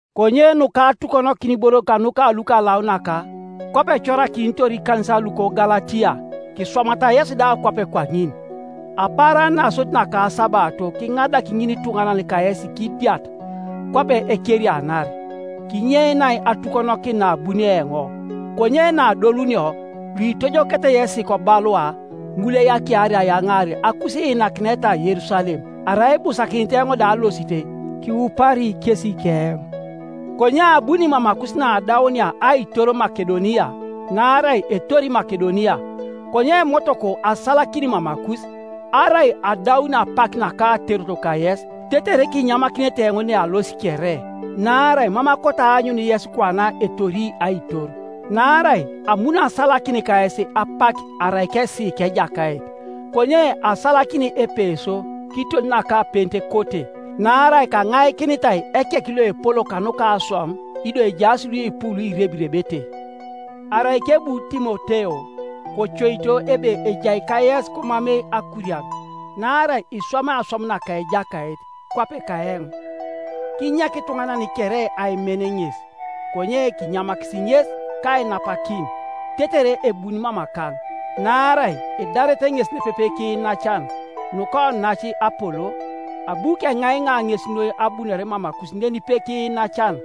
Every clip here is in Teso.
Konye nuka atukonokin iboro kanuka lukalaunak; kwape ekorakinitor ikanisan luka Galatia, kiswamata yesi da kwape kwaŋin. Apaaran nasodit naka asabato kiŋadak ŋinituŋanan kayesi kidiat, kwape ekerianar, kinyeinai atukonokin naabunio eoŋ, Konye naadolunio, luitojokete yesi kobalua, ŋul eyakiari ayaŋaar akusiinakineta Yerusalem. Arai ibusakinit eoŋ da alosit, kiupari kesi keoŋ. Konye abuni mamakus naadaunia aitor Makedonia, naarai etori Makedonia. Konye motoko asalakin mamakus, arai adaun apak naka aterot kayes, tetere kinyamakinete eoŋ nealosi kere. Naarai mam akoto aanyun yes kwana etori aitor; naarai amuno asalakin kayes apak arai keesiiki Ejakait. Konye asalakini Epeso kiton naka Pentekote, naarai kaŋaikinitai ekek loepol kanuka aswam, ido ejaas luipu luirebirebete. Arai kebu Timoteo, kocoito ebe ejai kayes komamei akurian, naarai iswamai aswam naka Ejakait, kwape kaeoŋ. Kinyek ituŋanan kere aimen ŋes. Konye kinyamakisi ŋes kainapakin, tetere ebuni mamakaŋ; naarai edaret ŋes nepepe kiinacan. Nuka onac Apolo, abu keŋaiŋa ŋes noi abunore mamakus nenipe kiinacan,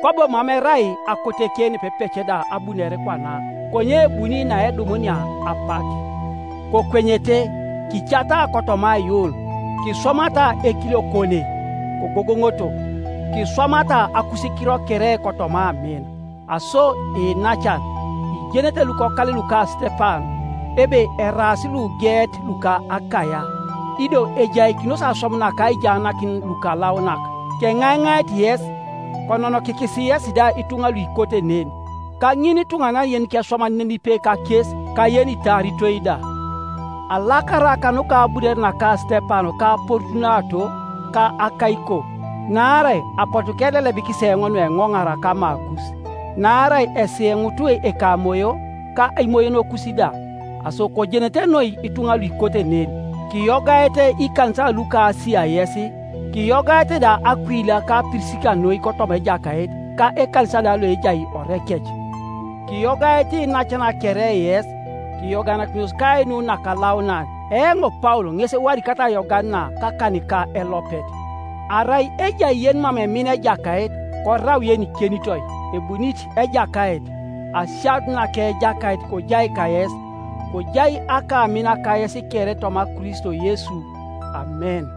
kwabo mam erai akoteke nepepec da abunore kwana. Konye ebuni naedumunia apak. Kokwenyete, kicata kotoma aiyuun, kiswamata ekiliokone, kogogoŋoto Kiswamata akusikiro kere kotoma amin. Aso iinacan, ijenete lukokale luka Sitepan, ebe eraas lugeet luka Akaia ido ejaikinos aswam naka aijaanakin lukalaunak; keŋaiŋait yes, kononokikisi yesi da ituŋa luikote nen, ka ŋinituŋanan yenikeswaman nenipe kakes ka yenitaaritoi da, Alakara kanuka abunore naka Sitepan ka Porutunato ka Akaiko, naarai apotu kelelebikis eoŋ nueŋoŋara kamakus; naara esiyeŋut ekamoyo, ka imoyonokus da. Aso kojenete noi ituŋa luikote nen. Kiyogaete ikanisan luka Asia yes. Kiyogaete da Akuila ka Pirisika noi kotoma Ejakait, ka ekanisa da loejai orekec. Kiyogaete iinacan kere yes. Kiyoganakinos kainu nakalaunan. Eoŋ Paul ŋes ewadikat ayogan na kakanika elopet. Arai ejai yenimam emina Ejakait, korau yenikenitoi. Ebunit Ejakait! Asianut naka Ejakait kojai kayes. Kojai akamina kayes kere toma Kristo Yesu Amen.